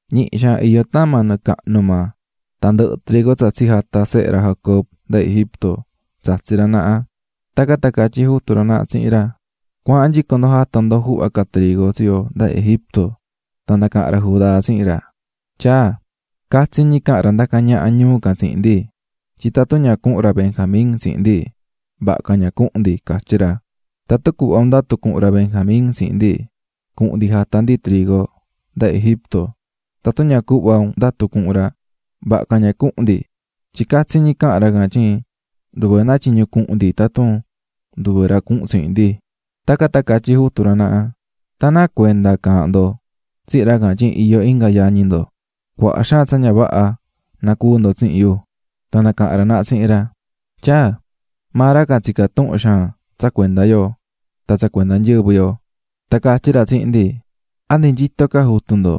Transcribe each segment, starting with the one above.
Ñihi xaan iyó tama nɨɨ cahnu maa, tan ndɨhɨ̱ trigo tsa tsijata̱ sehe ra Jacob nda Egipto tsatsi̱ ra naha, tacan tan catyí jutu ra naha tsihin ra: --Cua̱ahan nyico ndo jata ndo juhva ca trigo tsi yo nda Egipto. Tan nacaha̱n ra Judá tsihin ra: --Tyaa, catsi ñi caha̱n ra ndacá ñaha ñuu can tsihin ndi, tyin tatun ña cuhun ra Benjamin tsihin ndi, vaha ca ña cuhun ndi, catyí ra. Tatun cuhva un ndatu cuhun ra Benjamín tsihin ndi, cuhun ndi jata ndi trigo nda Egipto, tatun ña cuhva un ndatu cuhun ra, vaha ca ña cuhun ndi, tyin catsi ñi caha̱n ra can tyin nduve náa tyiñu cuhun ndi tatun nduve ra cuhun tsihin ndi. Tacan tan catyí jutu ra naha: --Tan, ¿náa cuenda caahán ndo tsihin ra can tyin iyó inga yañi ndo?, cuaha xaan tsa ña vaha nacuú ndo tsihin yu. Tan nacaha̱n ra naha tsihin ra: --Tyaa, maa ra can tsicá tuhun xaan tsa cuenda yo, tan tsa cuenda nyɨvɨ yo. Tan catyí ra tsihin ndi: ꞌ¿A ndi nyito ca jutu ndo?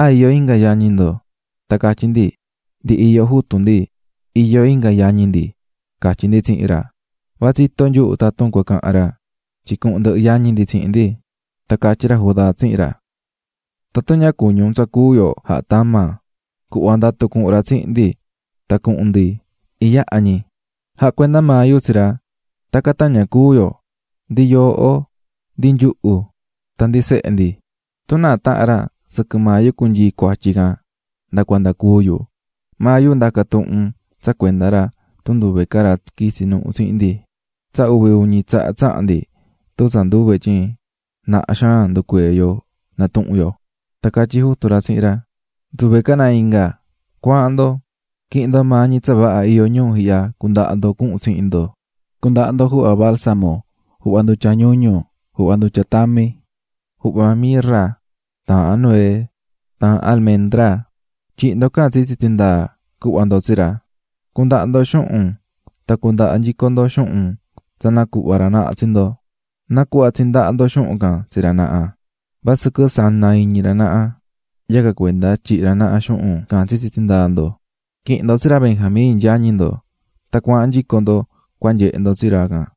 ¿A iyó inga yañi ndo?ꞌ Tan catyí ndi: ꞌNdi iyó jutu ndi, iyó inga yañi ndiꞌ, catyí ndi tsihin ra, va tsitó nyuhu tatun cua cahan ra tyin cuhun ndɨhɨ yañi ndi tsihin ndi. Tan catyí ra Judá tsihin ra: --Tatun ña cuñí un tsa cúu yo jahá tama, cu̱hva ndatu cuhun ra tsihin ndi tan cuhun ndi iyaha ñi, jacuenda maa yu tsi ra. Tacan tan ña cúu yo, ndi yooꞌo ndi nyuhu tan ndi sehe ndi. Tun náa tahan ra sɨquɨ maa yu cunyii cuatyi can nda cuanda cúu yu, maa yu ndaca tuhun un tsa cuenda ra tun nduve ca ra quitsi nuhu tsihin ndi. Tsa uvi uñi tsaha tsaha̱n ndi tun tsa nduve tyin naha xaan nducuee̱ yo natuhún yo. Tan catyí jutu ra tsihin ra: --Nduve ca náa inga, cua̱ahan ndo. Qui̱hin ndo maa ñi tsa vaha iyó ñuu ihya cundaha ndo cuhun tsihin ndo. Cu̱ndaha ndo juhva balsamo, juhva ndutya ñuñu, juhva ndutya tami, juhva mirra, taahan nuez taahan almendra, tyi̱hi ndo can tsitsi tindaa cuhva ndo tsi ra. Cu̱ndaha ndo xuhun tan cu̱ndaha nyico ndo xuhun tsa nacuhva̱ ra naha tsi ndo. Na̱cuhva tsihin ndaha ndo xuhun can tsi ra naha, vasɨquɨ naa̱ iñi ra naha yacan cuenda tyihi̱ ra naha xuhun can tsitsi tindaa ndo. Qui̱hin ndo tsi ra Benjamín, yañi ndo, tan cua̱ahan nyico ndo cua nyehe ndo tsi ra can.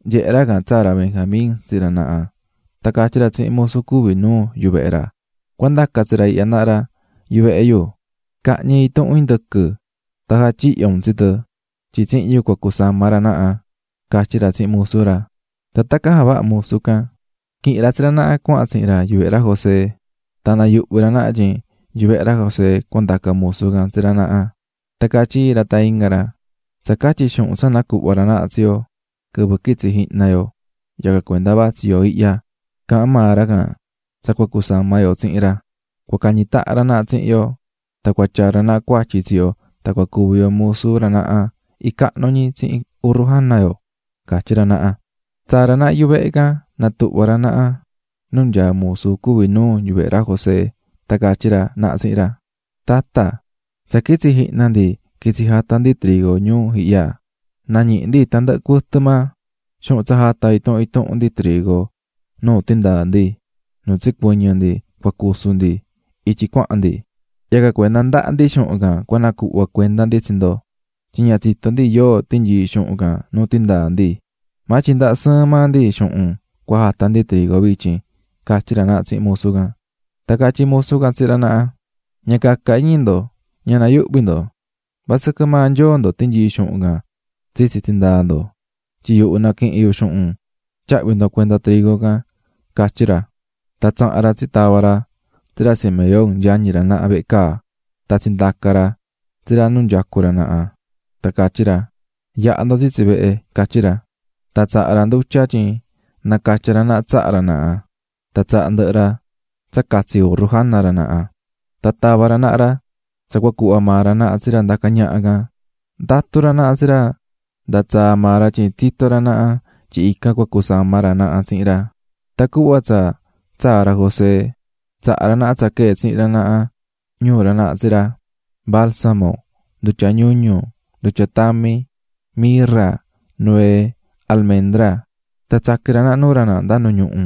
nyehe̱ ra can tsaa̱ ra Benjamín tsihin ra naha, tan catyí ra tsihin musu cuví nuu yuvehe ra: --Cua ndaca tsi ra ihya naha ra yuvehe yu, ca̱hñi intuhun indɨquɨ tan ja̱tyihyo un tsi tɨ, tyin tsihin yu cua cusama ra naha --catyí ra tsihin musu ra. Tan tacan javaha̱ musu can, quihi̱n ra tsi ra naha cuahan tsihin ra yuvehe ra José. Tan nayuhvi̱ ra naha tyin yuvehe ra José cuandacá musu can tsi ra naha, tan catyí iin ra tan inga ra: --Tsa catyi xuhun tsa nacuhva ra naha tsi yo quɨvɨ quitsi̱ jihna yo yacan cuenda vatsí yo ihya, caahán maa ra can tsa cua cusama yo tsihin ra, cua cañi tahan ra naha tsihin yo tan cua tyaa ra naha cuatyi tsi yo tan cua cuvi yo musu ra naha icahnu ñi tsihin urru jana yo ―catyí ra naha. Tsaa̱ ra naha yuvehe can, natuhva̱ ra naha nu nyaá musu cuví nuu yuvehe ra José tan catyí ra naha tsihin ra: --Tata, tsa quitsi̱ jihna ndi quitsi̱ jata̱ ndi trigo ñuu ihya, nañihi̱ ndi tandɨhɨ cuɨtɨ maa xuhun tsa jata̱ intuhun intuhun ndi trigo nu tindaa ndi nu tsicuɨñɨ̱ ndi cua cusu ndi ityi cuahan ndi, yacan cuenda ndahá ndi xuhun can cua nacuhva cuenda ndi tsi ndo, tyin ña tsitó ndi yóo tinyii̱ xuhun can nuu tindaa ndi, maa tyin ndahá sɨɨn maa ndi xuhun cua jata ndi trigo vityin --catyí ra naha tsihin musu can. Tan catyí musu can tsihin ra naha: --Ña caca iñi ndo, ña nayuhvi ndo. Vasɨquɨ maa nyoo ndo tinyii̱ xuhun can tsitsi tindaa ndo, tyin yuhu naquihi̱n yu xuhun tyahvi̱ ndo cuenda trigo can --catyí ra. Tan tsaha̱n ra tsitava̱ ra tsi ra Simeón, yañi ra naha, vehe caa tan tsindaca̱ ra tsi ra nu nyacú ra naha. Tan catyí ra: ―Ya̱ha ndo tsitsi vehe --catyí ra. Tan tsaha̱ ra ndutya tyin nacatya ra naha tsaha ra naha, tan tsaha̱ ndɨhɨ ra tsa catsi urru jana ra naha. Tan tava̱ ra naha ra tsa cua cuhva maa ra naha tsi ra ndacá ñaha can, ndatú ra naha tsi ra nda tsaa maa ra tyin tsitó ra naha tyin ican cua cusama ra naha tsihin ra. Tan cuhva tsa tsaa̱ ra José, tsaha̱ ra naha tsa quee̱ tsihin ra naha ñuu ra naha tsi ra: Balsamo, ndutya ñuñu, ndutya tami, mirra, nuez, almendra, tan tsaqui̱n ra naha nuu ra naha nda nu ñuhu.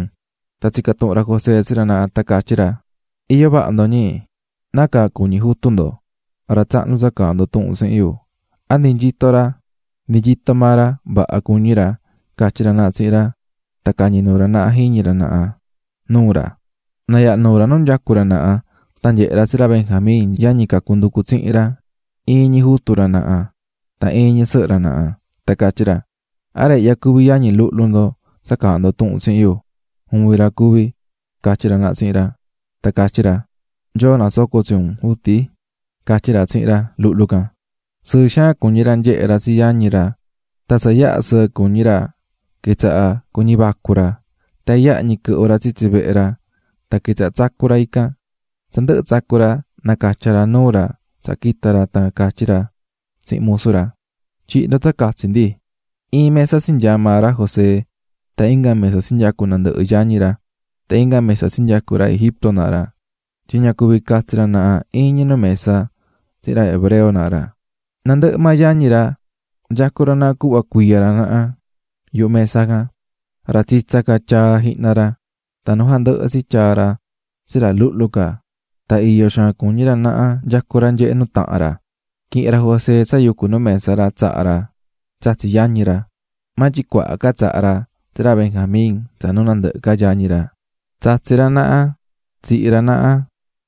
Tan tsica̱ tuhun ra José tsi ra naha, tan catyí ra: ―¿Iyó vaha ndo, ñi? ¿Nácaa cuñí jutu ndo, ra tsahnu tsa caahán ndo tuhun tsihin yu?, ¿a ndi nyito ra? ―Ndi nyito maa ra, vaha cuñí ra --catyí ra naha tsihin ra tan cañi̱ nuu ra naha jiñi ra naha nuu ra. Nayaha̱ nuu ra nu nyacú ra naha tan nyehe̱ ra tsi ra Benjamín yañi cacu nducu tsihin ra, iin ñi jutu ra naha tan iin ñi sɨhɨ ra naha, tan catyí ra: --¿A ra ihya cuví yañi luhlu ndo tsa caahán ndo tuhun tsihin yu? --Juvin ra cuví --catyí ra naha tsihin ra. Tan catyí ra: --¡Nyoo nasoco tsi un juti! --catyí ra tsihin ra luhlu can. Sɨɨ xaan cuñí ra nyehe̱ ra tsi yañi ra, tan tsa yaha sɨɨ cuñí ra quitsaha̱ cuñí vacu ra, tan iyaha ñi quɨhvɨ̱ ra tsitsi vehe ra tan quitsaha̱ tsacú ra ican. Tsa ndɨhɨ̱ tsacu̱ ra, nacatya̱ ra nuu ra tsaha quita̱ ra tan catyí ra tsihin musu ra: "Tyi̱hi ndo tsa catsi ndi." Iin mesa tsinyaa̱ maa ra José tan inga mesa tsinyacu̱ nandɨhɨ yañi ra, tan inga mesa tsinyacu̱ ra Egipto naha ra, tyin ña cuví catsi ra naha iin ñi nu mesa tsihin ra hebreo naha ra. Nandɨhɨ maa yañi ra nyacú ra naha cuhva cuiya ra naha yuhu mesa can, ra tsitsa ca tyaa̱ jihna ra, tan nu jandɨhɨ tsi tyaa̱ ra tsi ra luhlu ca, tan iyó xaan cuñí ra naha nyacú ra nyehé nuu tahan ra. Quihi̱n ra José tsa yucú nu mesa ra tsaha̱ ra tsatsi̱ yañi ra, maa tyin cuaha ca tsa tsaha̱ ra tsi ra Benjamín tsa nuu nandɨhɨ ca yañi ra. Tsatsi̱ ra naha tsihi̱ ra naha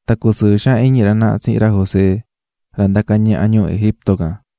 tan cusɨɨ̱ xaan iñi ra naha tsihin ra José, ra ndacá ñaha ñuu Egipto can.